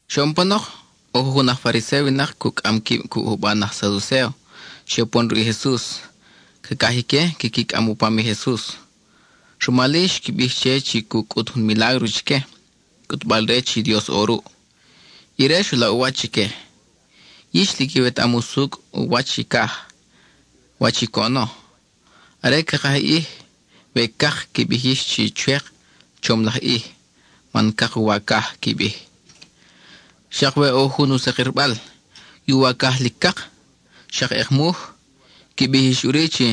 Xoʼon panok, ʼo jujun aj Fariséo winak cucʼam quib cuʼ juban aj Saducéo xe upon ruʼ i Jesus. Cacaj ique quiqui cʼam u pam i Jesus, rumal-i xqui bij che chi cu cʼut jun milágro chique, cʼutbal-re chi Dios ʼo ruʼ. Ire xu laʼ u wach chique: —Yix lic iwetaʼam usucʼ u wach i caj, wach i coʼono. Are ca kaj i ʼij, we cak, qui bij yix chi “Chwek, chom laj ʼij, man cak i uwacaj,” qui bij. Xak we ʼo jun u sakirbal, i uwacaj lic cak, xak ʼekmuj, qui bij yix ʼuri chi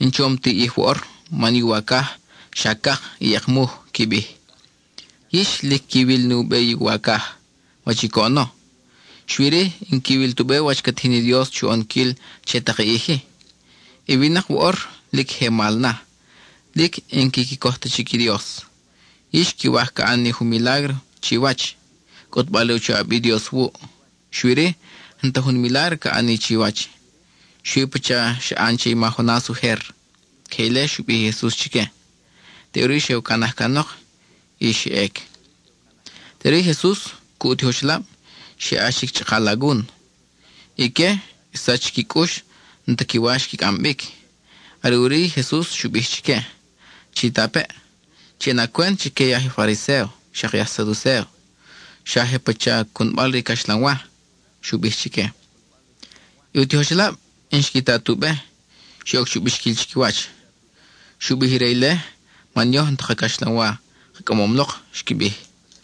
“N-chom ti ʼij woʼor, man i uwacaj xa cak y ʼekmuj,” qui bij. Yix lic quiwil nu be i uwacaj, wach i coʼono; xui-ri, n-quiwil tu be wach ca tijin i Dios chu ʼonquil che tak i ʼij-i. I winak woʼor, lic je mal na, lic n-quiqui coj ta chic i Dios. Yix quiwaj ca ʼan ni jun milágro chiwach, cʼutbal re u choʼab i Dios wuʼ. Xui-ri, n-ta jun milágro ca ʼan ni chiwach, xui pacha i xa ʼan che i ma Jonas ujer. (Queje ile xu bij i Jesus chique.) Teʼuri xe u canaj canok y xa ʼec. Teʼuri i Jesus cuʼ u tijoxelab, xe ʼax chic chʼaka alagun. Ique, xsach chiqui cʼux n-ta qui wa xqui cʼam bic. Are ʼuri i Jesus xu bij chique: —Chitapeʼ, chi ʼana cwent chique i aj Fariséo xak i aj Saducéo; xa je pacha cunbal re i caxlanwa —xu bij chique. I u tijoxelab n-xqui ta tu be; xe oc chu bixquil chiquiwach: —Xu bij ire ile man yoj n-ta ka caxlanwa ka cʼamom lok —xqui bij.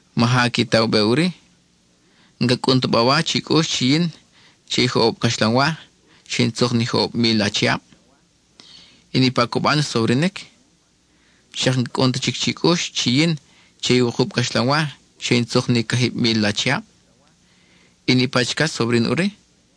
¿Maja qui ta u be ʼuri? ¿N-ca cʼun ta bawa chi cʼux chi yin, che i joʼob caxlanwa, xe in tzuk ni joʼob mil achiab? ¿I niʼpa i coban xsobrinic? ¿Xak n-ca cʼun ta chic chi cʼux chi yin, che i wukub caxlanwa, xe in tzuk ni cajib mil achiab? ¿I niʼpa chicach xsobrin ʼuri?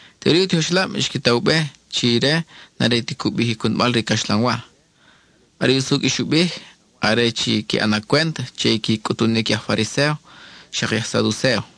Teʼuri i u tijoxelab xqui ta u be chi ire n-are ti cu bij i cunbal re i caxlanwa. Are i usucʼ i xu bij, are chi qui ʼana cwent che i qui cʼutunic i aj Fariséo xak i aj Saducéo.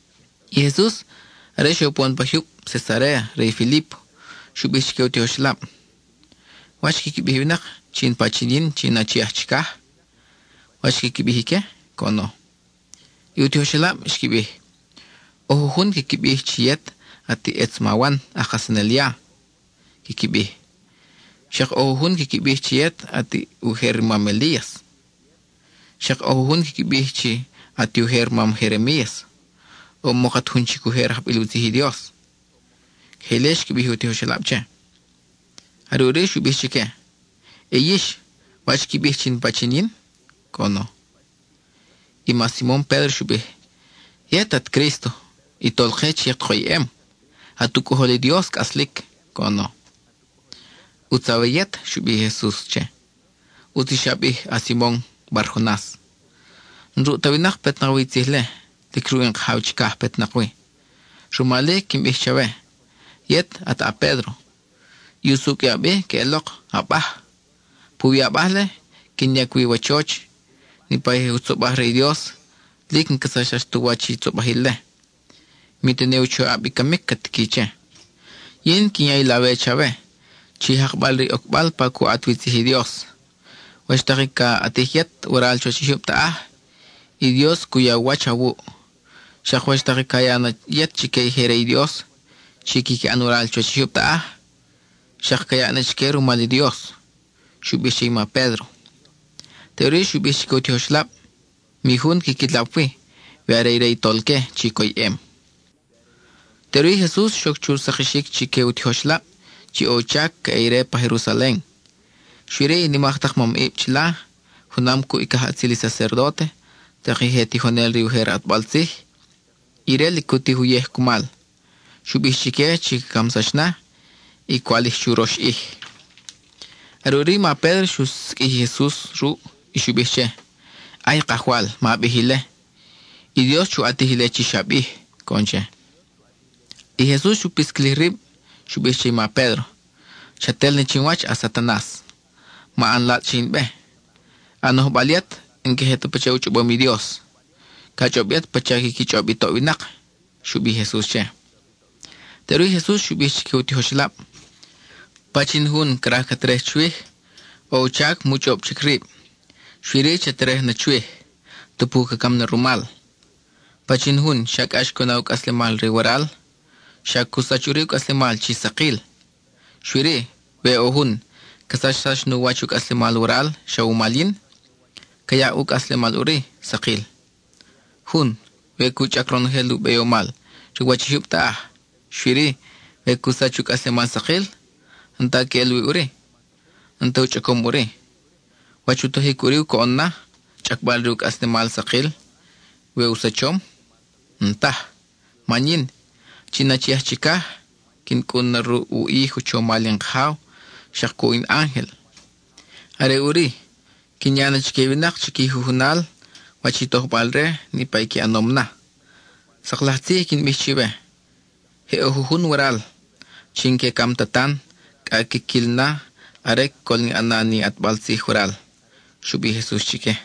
I Jesus, are xe upon pa jyub Cesaréa re i Filípo, xu bij chique u tijoxelab: —¿Wach quiqui bij i winak chi in pachin yin chi in Achi aj Chiaj? ¿Wach quiqui bij ique? —coʼono. I u tijoxelab xqui bij: —ʼO jujun quiqui bij chi yet at i ʼetz ma Wan aj kajsanel ya, quiqui bij. Xak ʼo jujun quiqui bij chi yet at i ujer mam Elías; xak ʼo jujun quiqui bij chi at i ujer mam Jeremías, o mok at jun chic ujer ajbil u tzij i Dios. (Queje ile xqui bij i tijoxelab che i Jesus.) Are ʼuri xu bij chique: —Y yix, ¿wach qui bij chi in pachin yin? —coʼono. I ma Simon Pédro xu bij: —Yet at Crísto (i Tolke chi at koyʼem); at u Cʼojol i Dios cʼaslic —coʼono. —¡ʼUtz awe yet! —xu bij i Jesus che—. ʼUtz i xa bij, a-Simon Bar-Jonas. N-ruʼ ta winak petnak wi i tzij-le; lic ruʼ in Kajaw chicaj petnak wi. Rumal-i, quin bij chawe: yet at a-Pédro, i usucʼ i a bi queʼelok “abaj”; puwi i abaj-le quin yac i wachoch. Niʼpa i je jutzobaj re i Dios, lic n-ca sachsax tu wach i tzobajil-le; mi tene i u choʼab i camic ca tique che. Yin quin ya i lawe chawe, chi jakbal-re i ocbal pa cu ʼat wi tzij i Dios. Wach tak i ca ʼatij yet waral chuwach i jyub taʼaj, i Dios cu ya u wach awuʼ. Xak wach tak ca ya na yet chique i je re i Dios chi quiqui ʼan waral chuwach i jyub taʼaj, xak ca yaʼ na chique rumal i Dios —xu bij che i ma Pédro. Teʼuri xu bij chique u tijoxelab mi jun quiqui lap wi, we are ire i Tolque chi coyʼem. Teʼuri i Jesus xoc chu sakixic chique u tijoxelab chi ʼo u chac ca ʼe ire pa Jerusalen, xui-ri i nimak tak mamʼib chila, junam cuʼ i cajʼatzil i sacerdóte, tak i je tijonel re i ujer ʼatbal tzij, ire lic cu tij uyej cumal. Xu bij chique chi ca camsax na, y ca walij churox ʼij. Are ʼuri i ma Pédro xu siqʼuij i Jesus ruʼ, y xu bij che: —¡Ay, Kajwal! ¡Ma bij ile! I Dios chu ʼatij ile chi xa bij —coʼon che. I Jesus xu pisquilij rib; xu bij che i ma Pédro: —¡Chat el na chin wach, a-Satanas! Ma ʼan latzʼ che in be. A nojbal yet n-queje ta pacha u chʼobom i Dios. Ca chʼob yet pacha quiqui chʼob i toʼ winak —xu bij i Jesus che. Teʼuri i Jesus xu bij chique u tijoxelab: —Pachin jun craj ca terej chwij, ʼo u chac mu chʼob chic rib, xui-ri cha terej na chwij, tupu ca cam na rumal. Pachin jun xa cʼax cu na u cʼaslemal re waral, xa cu sach ʼuri u cʼaslemal chi sakil. Xui-ri, we ʼo jun ca sachsax nu wach u cʼaslemal waral xa wumal yin, ca yaʼ ʼuri u cʼaslemal sakil. Jun, we cu chʼac ronojel i beyomal re u wach i jyub taʼaj, xui-ri we cu sach u cʼaslemal sakil, n-ta queʼel wi ʼuri, n-ta u chʼacom ʼuri. ¿Wach u tojic ʼuri coʼon na, chʼacbal re u cʼaslemal sakil, we u sachom? N-taj. Man yin, chi in Achi aj Chicaj, quin cʼun na ruʼ u ʼij u chomal in Kajaw, xak cuʼ in ángel. Are ʼuri, quin ya na chique i winak chiqui jujunal wach i tojbal-re niʼpa qui ʼanom na. Sak laj tzij i quin bij chiwe, je ʼo jujun waral chi n-que cam ta tan, cʼa quin quil na are col in ʼana ni in ʼatbal tzij waral —xu bij i Jesus chique.